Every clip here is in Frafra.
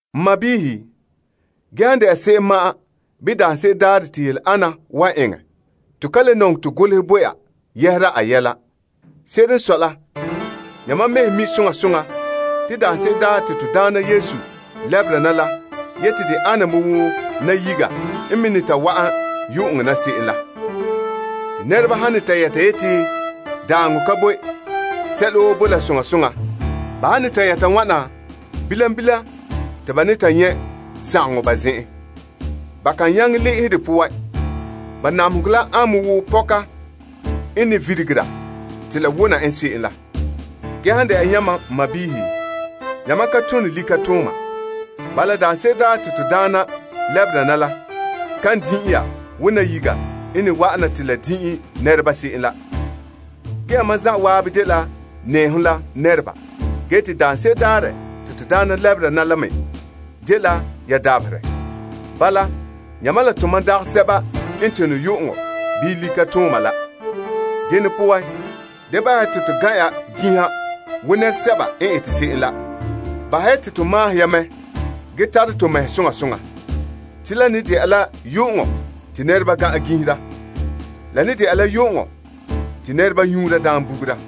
N sɔɔnrɔ, ge han de'a se'em ma'an bii daanse'ere daarɛ te yele ana wan eŋɛ, to ka le nɔŋɛ to golehɛ bo ya yɛhera a yɛla. Se'ere n sɔe la, yamam mɛhe mi' soŋa soŋa te Na'ayenɛ daarɛ wan wa'ana la ana me wo nayiga n me ne ta wa'an yu'uŋɔ na se'em la. Te nɛreba han ne ta yɛta yeti, Daaŋɔ ka boe, sɛla woo bo la soŋa soŋa. Ba han ne ta yɛta wana, bilam bilam te ba ne ta nyɛ' sagaŋɔ ba zen'en. Ba kan nyaŋɛ le'ehɛ de poan. Ba namehegɔ la an me wo pɔka n ne virigera te la wona en se'em la. Ge, han de'a yamam n sɔɔnrɔ, yamam ka tone likatooma. Bala, daanse'ere daarɛ te to Daana lɛbera na la kan ta'an din'i ya wo nayiga n ne wa'ana te la din'i nɛreba se'em la. Ge yamam zan'an dela nɛɛhom la nɛreba. Ge te daanse'ere daarɛ te to Daana lɛbera na la me dela ya dabaherɛ. Bala, yamam la tomam dagɛ sɛba n tone yu'uŋɔ bii likatooma la. Dene poan, da bahɛ ya te to gan' ya ginha wo nɛresɛba n ete se'em la. Bahɛ ya te to maahom ya mɛ ge tara to mɛhe soŋa soŋa. Te la ne de'a la yu'uŋɔ te nɛreba gan'an ginhera. La ne dɛna la yu'uŋɔ te nɛreba nyuura daam bugura.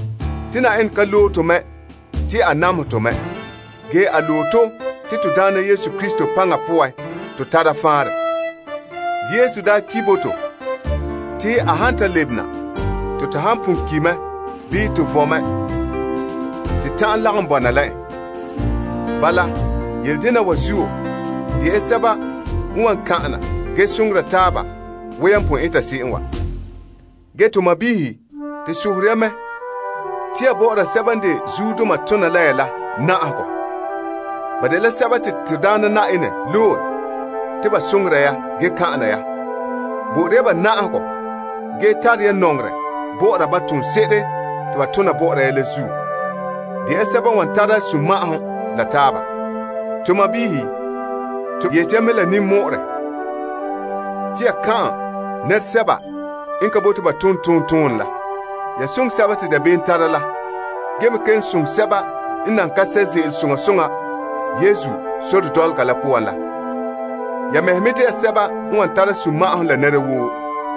Te Na'ayenɛ ka loe to mɛ te a namehɛ tɔ mɛ. Ge a loe to te Na'ayenɛ Yesu Krista paŋa poan to tara faanrɛ. Ge Yesu daa ki' bo to te a han ta lebena, te to han pon ki' mɛ bii to vo'e mɛ te ta'an lagom bɔna la en. Bala, yele dena wa zuo, de ya sɛba n wan kpemehe ya ge soŋora taaba wo yan pon eta se'em wa. Ge to sɔɔnrɔ, to sohore ya mɛ te ya bɔ'ɔra sɛba n de zuodoma tona la ya la na'ahegɔ. Ba dela sɛba te Na'ayenɛ loe te ba soŋora ya ge kan'ana ya. Bo'ore ya ba na'ahegɔ ge tare ya nɔŋerɛ bɔ'ɔra ba toonse'ere te ba tona bɔ'ɔra ya la zuo. De ya sɛba n wan tara sunma'ahom la taaba. To sɔɔnrɔ, to yeti ya mɛ la ninmɔ'ɔrɛ te ya kan'an nɛresɛba n ka bote ba tom tontonɛ la. Ya soŋɛ sɛba te dabeem tara la ge me kelom soŋɛ sɛba n nan ka sɛ' ze'ele soŋa soŋa Yesu sore dɔlɔga la poan la. Ya mɛhe me dɛna sɛba n wan tara sugure la nɛra woo.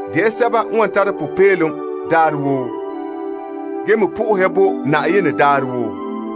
De ya sɛba n wan tara popeelom daarɛ woo, ge me sohora Yenɛ daarɛ woo,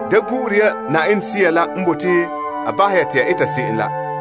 Da gu'ure ya Yenɛ Sea la n bote a bahɛ ya te ya eta se'em la.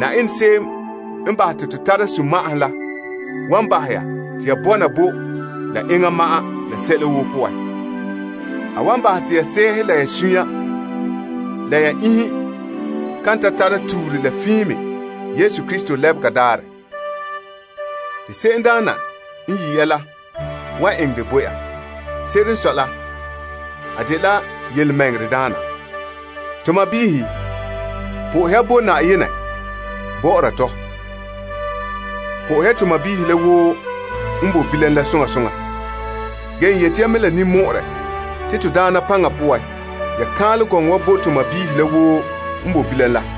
Yenɛ se'em n bahɛ te to tara sunma'ahom la wan bahɛ ya te ya bɔna bo la enŋa ma'an sɛla woo poan. A wan bahɛ te ya sɛɛhe la ya suunre, la ya iinhe kan ta tara tuure la fiin me to Na'ayenɛ Yesu Krista lebega daarɛ. Te se'emdaana n yi' ya la wan eŋɛ dɛ bo ya. Se'ere n sɔe la a dela birikina. To sɔɔnrɔ, sohore ya Yenɛ bɔ'ɔra tɔ. Po'ohɛ ya to sɔɔnrɔ la woo n boe bilam la soŋa soŋa. Ge n yeti ya mɛ la ninmɔ'ɔrɛ te Na'ayenɛ paŋa poan, ya kaanlɛ gɔŋɔ wa bo to sɔɔnrɔ la woo n boe bilam la.